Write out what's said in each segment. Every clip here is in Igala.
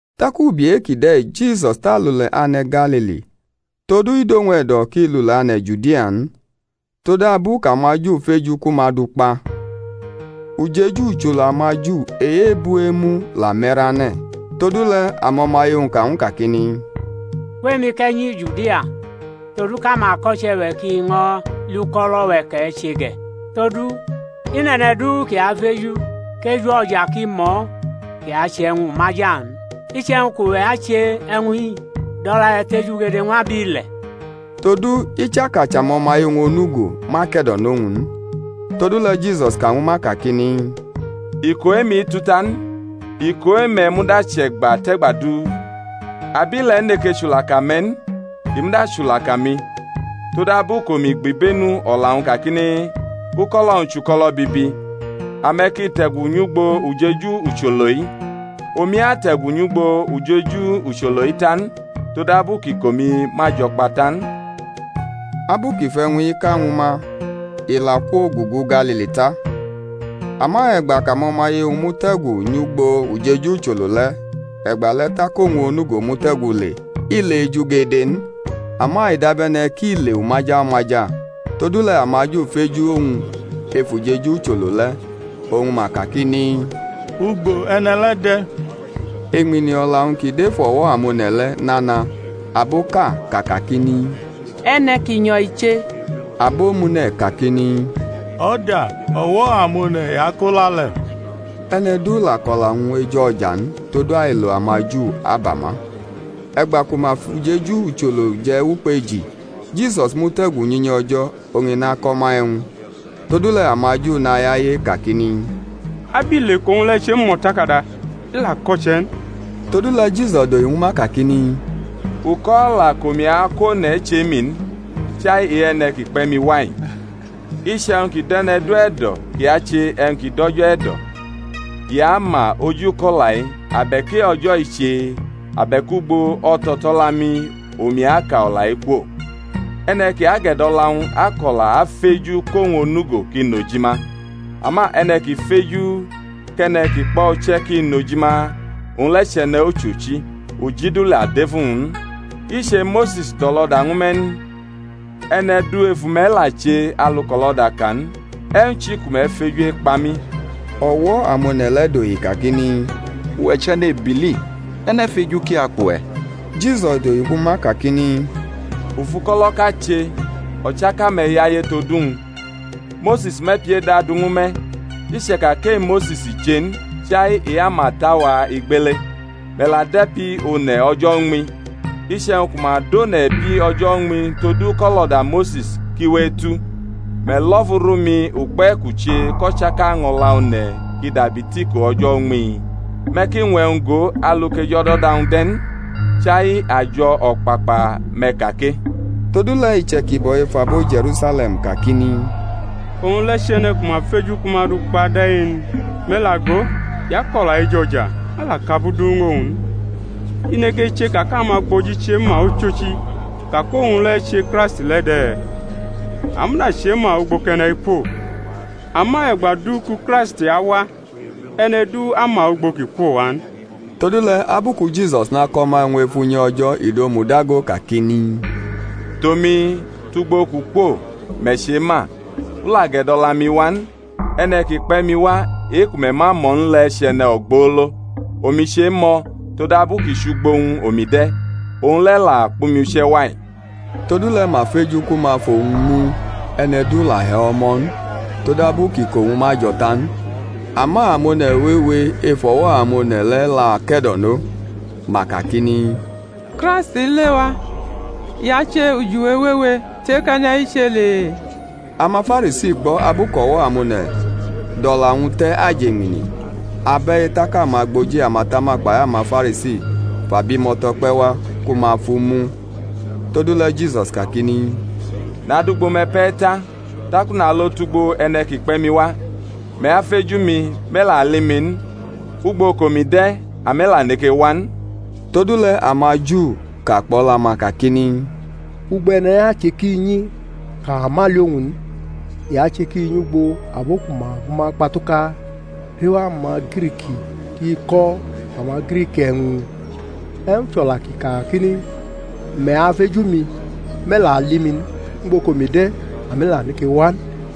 Tak ubi e-kide̩ Jisus tʼalule̩ ane̩ Galili, todu i dʼowñ e̩do̩ kʼi lule̩ ane̩ Judia n, todabu kʼamaJu feju ku ma dʼu kpa. Ujeju ucholo amaJu e-ebu-emu la me̩rane̩. Todule̩ amo̩maye-wñ ka ñw u kakini, Kwʼemi, kʼe̩ nyi Judia, todu kʼamako̩che̩-we̩ ki ño̩ li uko̩lo̩-we̩ kʼe̩ che ge̩. Todu i nʼe̩ne̩ du ki afeju kʼeju o̩ja ki mʼo̩ kʼi ache e̩wñ umaja n. Iche̩wñ kʼuwe̩ ache e̩wñ-i, dʼo̩la-we̩ tejugede ñw ab ile̩. Todu ichaka chʼamo̩maye-wñ onugo ma ke̩do̩nʼowñ n. Todule̩ Jisus ka ñwu ma kakini, Iko e-mi tu ta n; iko e-me̩ muda chʼe̩gba tʼe̩gba du. Abile̩ neke chulaka me̩ n; i muda achulaka mi, todabu kʼomi gbibenu o̩la-wñ kakini, Uko̩lo̩-wñ chʼuko̩lo̩ bibi. Ame̩ ki te̩gu nyʼugbo ujeju ucholo-i; omi ate̩gu nyʼugbo ujeju ucholo-i ta n, todabu kʼiko-mi ma jo̩ kpa ta n. Abu kʼi fʼe̩wñ-i ka ñwu ma, i la kwogugu Galili ta. Ama e̩gba kʼamo̩maye-wñ mute̩gu nyʼugbo ujeju ucholo le̩, e̩gbale̩ tak owñ onugo mute̩gu le, i le ejugede n, ama i dabe̩ne̩ kʼi le umaja umaja. Todule̩ amaJu feju-wñ ef ujeju ucholo le̩ oñ ma kakini, Ugbo e̩ne̩ le̩ de̩? Eñmini o̩la-wñ ki dʼef o̩wo̩-amone̩ le̩ nana; aboʼka ka kakini, E̩ne̩ ki nyo̩ i che; abomune̩ kakini, O̩da, o̩wo̩ amone̩ i ako la le̩. E̩ne̩ du la kʼo̩la-wñ ejo̩ja n, todu ailo amaJu aba ma. E̩gba ku ma fʼujeju ucholo je̩ wʼukpeji, Jisus mute̩gu nyʼunyi O̩jo̩, oñ i nako̩ ma e̩wñ. Todule̩ amaJu nayaye kakini, Abile kʼowñ le̩ chemʼo̩takada? I la ko̩che̩ n. Todule̩ Jisus dohi ñwu ma kakini, Uko̩o̩la kʼomi ako̩ one̩ chʼe-mi n, chai e-e̩ne̩ ki kpe̩ mi wa-i. Iche̩wñ ki du e̩ne̩ du e̩do̩ ki ache e̩wñ ki dʼO̩jo̩ e̩do̩, i ama oji uko̩-o̩la-i abe̩k e-O̩jo̩ i che, abe̩k ugbo o̩to̩to̩la-mi omi aka o̩la-i kwo. E̩ne̩ ki agʼe̩do̩la-wñ ako̩la afeju kʼowñ onugo ki nʼojima, ama e̩ne̩ ki feju kʼe̩ne̩ ki kpʼo̩ uche̩ ki nʼojima, owñ le̩ chʼe̩ne̩ ochochi, uji du la dʼef uwñ n. I che Mose̩s dʼo̩lo̩da ñwu me̩ n? E̩ne̩ du ef ume̩ la che alu kʼo̩lo̩da ka n. E̩wñ chi ku me̩ feju ekpa mi? O̩wo̩-amone̩ le̩ dohi kakini, Uwe̩ chenʼebili, e̩ne̩ feju ki akpʼuwe̩? Jisus dohi ñwu ma kakini, U fʼuko̩lo̩ʼka che, o̩chaka me̩ yaye todu wñ. Mose̩s mʼe̩pi-eda du ñwu me̩ (i chʼeka kʼe-Mose̩s i che n, chai e-amata-wa igbele); me̩ la dʼe̩pi one̩ o̩jo̩ uñmi. Iche̩wñ ku ma dʼone̩ e̩pi o̩jo̩ uñmi todu kʼo̩lo̩da Mose̩s ki we etu, me̩ lo̩fu rʼumi ukpe̩ kʼu che kʼo̩chaka año̩la one̩ ki dabi tiko o̩jo̩ uñmi? Me̩ ki ñwʼe̩wñ go alu kʼejo̩do̩da-wñ de̩ n; chai ajo̩ o̩kpakpa me̩ ka ke. Todule̩ iche̩kibo̩ ef abo Je̩rusale̩m kakini, Owñ le̩ chʼe̩ne̩ ku ma feju ku ma du kpa de̩-i n? Me̩ la go, i ako̩la ejo̩ja, ma la kʼabu du ñw owñ n. I neke chʼeka kʼamagboji chema ochochi ka kʼowñ le̩ che Kraisti le̩ de̩? A muda chema ugbo kʼe̩ne̩-i kwo; ama e̩gba du ku Kraisti awa, e̩ne̩ du ama ugbo kʼi kwo wa n. Todule̩ abu ku Jisus nako̩ ma e̩wñ ef unyi O̩jo̩, i domudago kakini, Tʼomi, tʼugbo kʼu kwo, me̩ chema; u la gʼe̩do̩la mi wa n, e̩ne̩ ki kpe̩ mi wa e-ku me̩ ma mʼo̩ n le̩ chʼe̩ne̩ ogbolo. Omi chemʼo̩, todabu ki chʼugbo wñ omi de̩, owñ le̩ la kpʼumi uche̩ wa-i. Todule̩ ma feju ku ma fʼowñ mu; e̩ne̩ du la hi o̩wo̩ mʼo̩ n, todabu kʼiko-wñ ma jo̩ ta n. Ama amone̩ wewe ef o̩wo̩-amone̩ le̩ la ke̩do̩nʼo. Ma kakini, Kraisti lewa, i ache ujiwe wewe tʼe-kʼe̩ne̩-i che le? AmaFarisi gbo̩ abu kʼo̩wo̩-amone̩ dʼo̩la-wñ te̩ ajeñmini, abe̩-i; tak amagboji amatama kpai amaFarisi fʼabimo̩to̩ kpe̩ wa ku ma fʼu mu. Todule̩ Jisus kakini, Nadʼugbo me̩ pe̩ ta, tak u nalo tʼugbo e̩ne̩ ki kpe̩ mi wa. Me̩ afeju mi, me̩ la ali mi n; ugbo kʼomi de̩, ame̩ la neke wa n. Todule̩ amaJu ka kpʼo̩la-ma kakini, Ugbo e̩ne̩-i ache kʼi nyi, kʼawa ma ali owñ n? i ache kʼi nyʼugbo abo ku ma fʼuma kpatuka rʼef amaGrik, kʼi ako̩ amaGrik e̩wñ? E̩wñ chʼo̩la kʼi ka-i kakini, Me̩ afeju mi, me̩ la ali mi n, ugbo kʼomi de̩, ame̩ la neke wa n?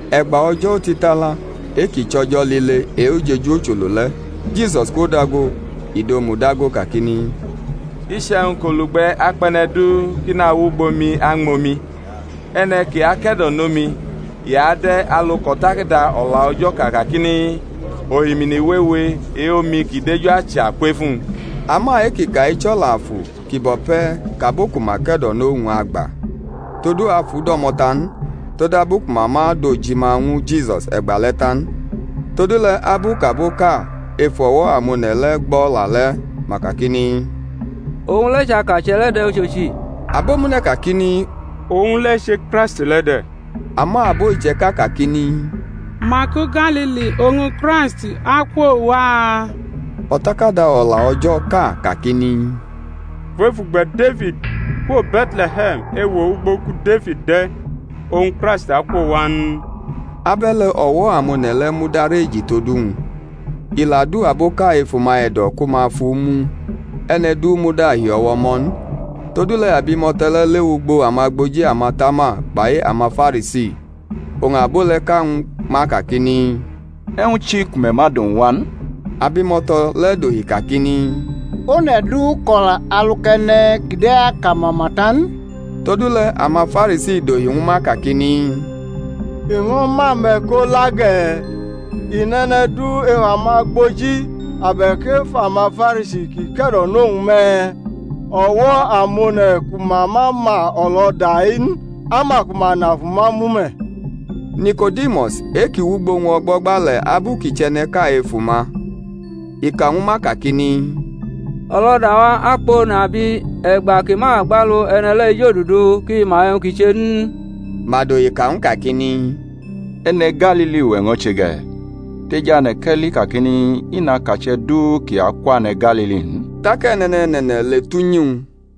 E̩gba o̩jo̩ otitala e-ki chʼo̩jo̩ lile e-ujeju ucholo le̩, Jisus kwodago, i domudago kakini, Iche̩wñ kʼolugbe̩ akpʼe̩ne̩ du kʼi nawʼugbo mi añmʼomi. E̩ne̩ ki ake̩do̩no mi, i ade̩ alu kʼO̩takada O̩la O̩jo̩ ka kakini, Ohimini wewe e-omi ki deju acha kwef uwñ. Ama e-kʼi ka-i chʼo̩la Afu, ki bo̩ pe̩ kʼabo ku ma ke̩do̩nʼowñ agba: todu Afu do̩mo̩ ta n, todabu ku ma ma dʼojima ñwu Jisus e̩gbale̩ ta n. Todule̩ abu kʼaboʼka ef o̩wo̩-amone̩ le̩ gbʼo̩la le̩, ma kakini, Owñ le̩ chʼakache̩ le̩ de̩ ochochi. Abo-mune̩ kakini, Owñ le̩ che Kraisti le̩ de̩. Ama abo iche̩ka kakini, Maku Galili oñ Kraist akwo wa? O̩takada O̩la O̩jo̩ ka kakini, Kwef ugbe̩ Defid, kwo Be̩tle̩he̩m, ewo ugbo ku Defid de̩ oñ Kraist akwo wa n? Abe̩le̩ o̩wo̩-amone̩ le̩ mudareji tod owñ. I la du aboʼka ef uma e̩do̩ ku ma fʼu mu, e̩ne̩ du muda hi e̩wo̩ mʼo̩ n. Todule̩ abimo̩to̩ le̩ lewʼugbo amagboji amatama kpai amaFarisi; oñ abo le̩ ka ñwu ma kakini, E̩wñ chi ku me̩ ma dʼowñ wa n? Abimo̩to̩ le̩ dohi kakini, One̩ du ko̩la alu kʼe̩ne̩ kide̩ aka mama ta n. Todule̩ amaFarisi dohi ñwu ma kakini, I ño̩ mʼame̩ ko la ge̩? I nʼe̩ne̩ du ef amagboji abe̩k ef amaFarisi kʼi ke̩do̩nʼowñ me̩? O̩wo̩-amone̩ ku ma ma ma o̩lo̩da-i n, ama ku ma na fʼuma mu me̩. Niko̩dimus e-kʼi wʼugbo wñ o̩gbo̩gba le̩ abu kʼi chʼe̩ne̩ʼka ef uma, i ka ñwu ma kakini, O̩lo̩da-wa akpʼone̩ abi e̩gba ki ma gbʼalu e̩ne̩ le̩ ejodudu kʼi ma e̩wñ kʼi che n? Ma dohi ka ñw u kakini, E̩ne̩ Galili uwe̩ ño̩ che ge̩? Tejane̩ kʼe̩ li kakini, I nʼakache̩ du kʼi akwane̩ Galili n. [ Tak e̩ne̩ne̩ne̩ne̩ le tʼunyi-wñ.